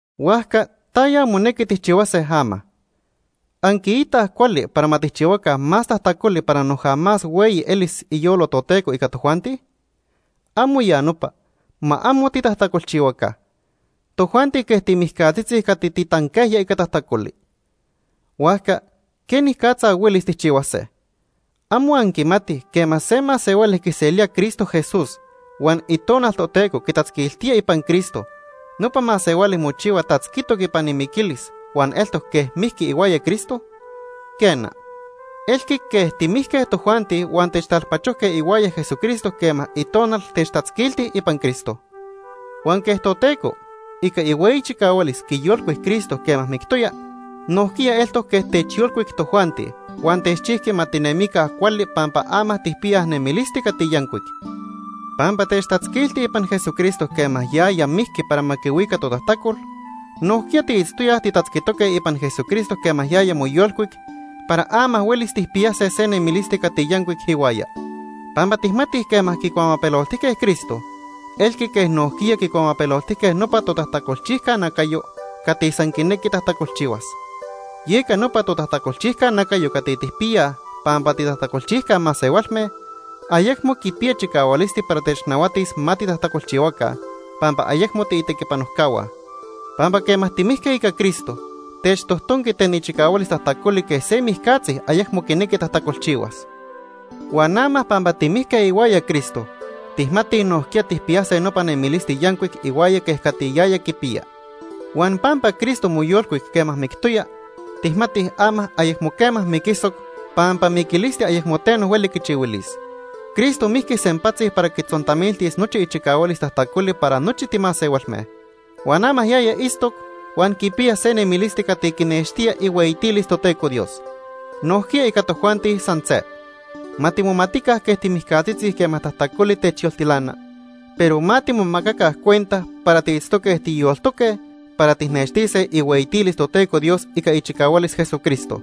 ¿Huajca taya monequi tijchihuase ama? ¿Anquiitaj cuali para ma tijchihuaca más tajtacoli para noja más hueyi elis iyolo Toteco ica tojuanti? ¡Amo ya nopa! Ma amo titajtacolchihuaca. Tojuanti quej timijcatzitzi cati titanquejya ica tajtacoli. Huajca ¿quenicatza huelis tijchihuase? ¿Amo anquimatij quema se masehuali quiselía Cristo Jesús huan Itonal Toteco quitatzquiltía ipan Cristo, nopa masehuali mochihua tatzquitoc ipan imiquilis huan eltoc quej mijqui ihuaya Cristo? Quena, elqui quej timijque tojuanti huan techtalpachojque ihuaya Jesucristo quema Itonal techtatzquilti ipan Cristo. Huan quej Toteco, ica ihueyi chicahualis, quiyolcuic Cristo quema mictoya, nojquiya eltoc quej techyolcuic tojuanti huan techchijqui ma tinemica cuali pampa ama tijpiyaj nemilisti cati yancuic. Pampa techtatzquiltij ipan Jesucristo quema yaya mijqui para ma quihuica totajtacol, nojquiya tiitztoyaj titatzquitoque ipan Jesucristo quema yaya moyolcuic para ama huelis tijpiyase se nemilisti cati yancuic ihuaya. Pampa tijmatij quema quicuamapeloltijque Cristo, elqui quej nojquiya quicuamapeloltijque nopa totajtacolchijca nacayo cati san quinequi tajtacolchihuas. Yeca nopa totajtacolchijca nacayo cati tijpiyaj pampa titajtacolchijca masehualme, ayecmo quipiya chicahualisti para technahuatis ma titajtacolchihuaca, pampa ayecmo tiitequipanojcahua. Pampa quema timijque ica Cristo, techtojtonqui ten ichicahualis tajtacoli quej se mijcatzi ayecmo quinequi tajtacolchihuas. Huan ama pampa timijque ihuaya Cristo, tijmatij nojquiya tijpiyase nopa nemilisti yancuic ihuaya quej cati yaya quipiya. Huan pampa Cristo moyolcuic quema mictoya, tijmatij ama ayecmo quema miquisoc pampa miquilisti ayecmo teno hueli quichihuilis. Cristo mijqui sempatzi para quitzontamiltis nochi ichicahualis tajtacoli para nochi timasehualme. Huan ama yaya itztoc huan quipiya se nemilisti cati quinextía ihueyitilis Toteco Dios. Nojquiya ica tojuanti san se. Ma timomatica quej timijcatzitzi quema tajtacoli techyoltilana, pero ma timomacaca cuenta para tiitztoque tiyoltoque para tijnextise ihueyitilis Toteco Dios ica ichicahualis Jesucristo.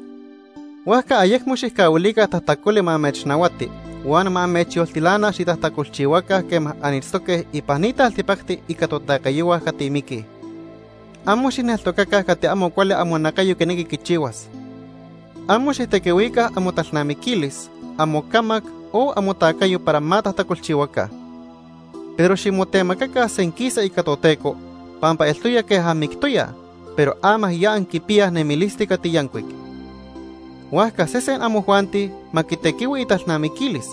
Huajca ayecmo xijcahuilica tajtacoli ma amechnahuati huan ma amechyoltilana xitajtacolchihuaca quema anitztoque ipan ni taltipacti ica totacayohua cati miquij. Amo xijneltocaca cati amo cuali amonacayo quinequi quichihuas. Amo xijtequihuica amotalnamiquilis, amocamac o amotacayo para ma tajtacolchihuaca. Pero ximotemacaca senquisa ica Toteco pampa eltoya quej anmictoyaj, pero ama ya anquipiyaj nemilisti cati yancuic. Huajca sesen amojuanti ma quitequihui italnamiquilis,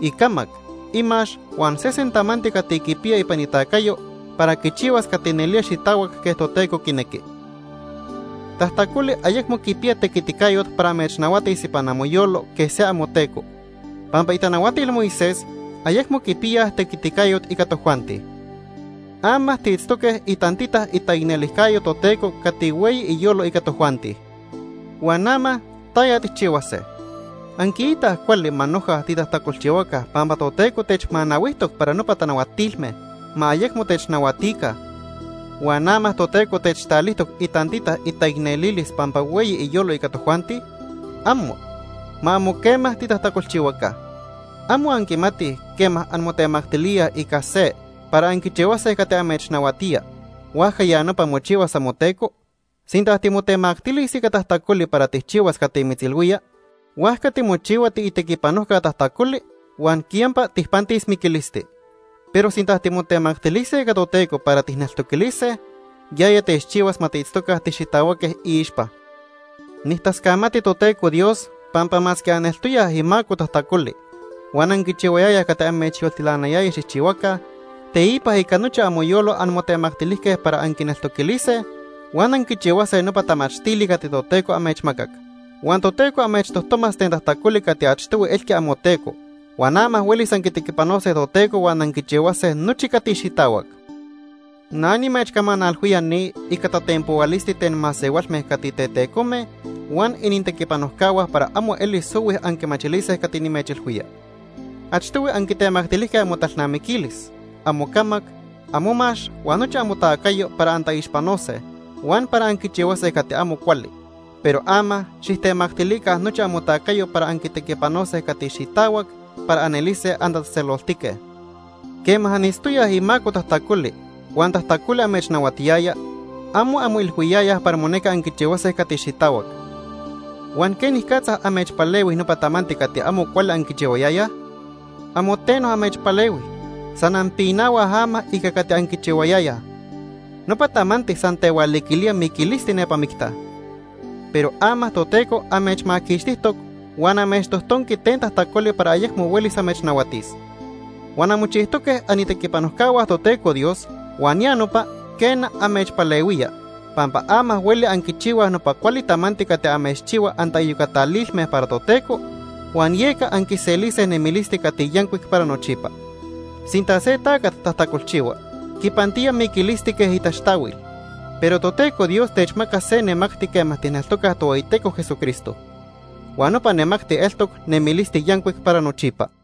icamac, imax huan sesen tamanti cati quipiya ipan itacayo para quichihuas cati nelía xitahuac quej Toteco quinequi. Tajtacoli ayecmo quipiya tequiticayot para amechnahuatis ipan amoyolo quej se amoteco, pampa itanahuatil Moisés ayecmo quipiyaj tequiticayot ica tojuanti. Ama tiitztoque itantita itaicnelijcayo Toteco cati hueyi iyolo ica tojuanti. Huan ama ¿taya tijchihuase? ¿Anquiitaj cuali ma noja titajtacolchihuaca pampa Toteco techmanahuijtoc para nopa tanahuatilme ma ayecmo technahuatica huan ama Toteco techtalijtoc itantita itaicnelilis pampa hueyi iyolo ica tojuanti? ¡Amo! Ma amo quema titajtacolchihuaca. ¿Amo anquimatij quema anmotemactilíaj ica se para anquichihuase cati amechnahuatía, huajca ya nopa mochihuas amoteco? Sinta timotemactilis ica tajtacoli para tijchihuas cati mitzilhuía, huajca timochihua tiitequipanojca tajtacoli huan quiyampa tijpantis miquilisti. Pero sinta timotemactilise ica Toteco para tijneltoquilise, yaya techchihuas ma tiitztoca tixitahuaque iixpa. Nijtascamati Toteco Dios pampa masque aneltoyaj imaco tajtacoli huan anquichihuayayaj cati amechyoltilanayaya xijchihuaca, teipa ica nochi amoyolo anmotemactilijque para anquineltoquilise huan anquichihuase nopa tamachtili cati Toteco amechmacac. Huan Toteco amechtojtomas ten tajtacoli cati achtohui elqui amoteco, huan ama huelis anquitequipanose Toteco huan anquichihuase nochi cati xitahuac. Na nimechcamanalhuía ni ica tatenpohuilisti ten masehualme cati tetecome huan inintequipanojcahua para amo elis ohui anquimachilise cati nimechilhuía. Achtohui anquitemactilijque amotalnamiquilis, amocamac, amomax huan nochi amotacayo para antaixpanose huan para anquichihuase cati amo cuali, pero ama xijtemactilica nochi amotacayo para anquitequipanose cati xitahuac para anelise antatzejtzeloltique. Quema anitztoyaj imaco tajtacoli huan tajtacoli amechnahuatiyaya, amo anmoilhuiyayaj para monequi anquichihuase cati xitahuac. Huan ¿quenicatza amechpalehui nopa tamanti cati amo cuali anquichihuayayaj? Amo teno amechpalehui. San anpinahuaj ama ica cati anquichihuayayaj. Nopa tamanti san tehualiquilía miquilisti nepa micta. Pero ama Toteco amechmaquixtijtoc huan amechtojtonqui ten tajtacoli para ayecmo huelis amechnahuatis. Huan anmochijtoque anitequipanojcahua Toteco Dios huan ya nopa, quena, amechpalehuía pampa ama hueli anquichihuaj nopa cuali tamanti cati amechchihua antaiyocatalilme para Toteco huan yeca anquiselise nemilisti cati yancuic para nochipa. Sinta se tacat tajtacolchihua, quipantía miquilisti quej itaxtahuil, pero Toteco Dios techmaca se nemacti quema tijneltocaj Tohueyiteco Jesucristo, huan nopa nemacti eltoc nemilisti yancuic para nochipa.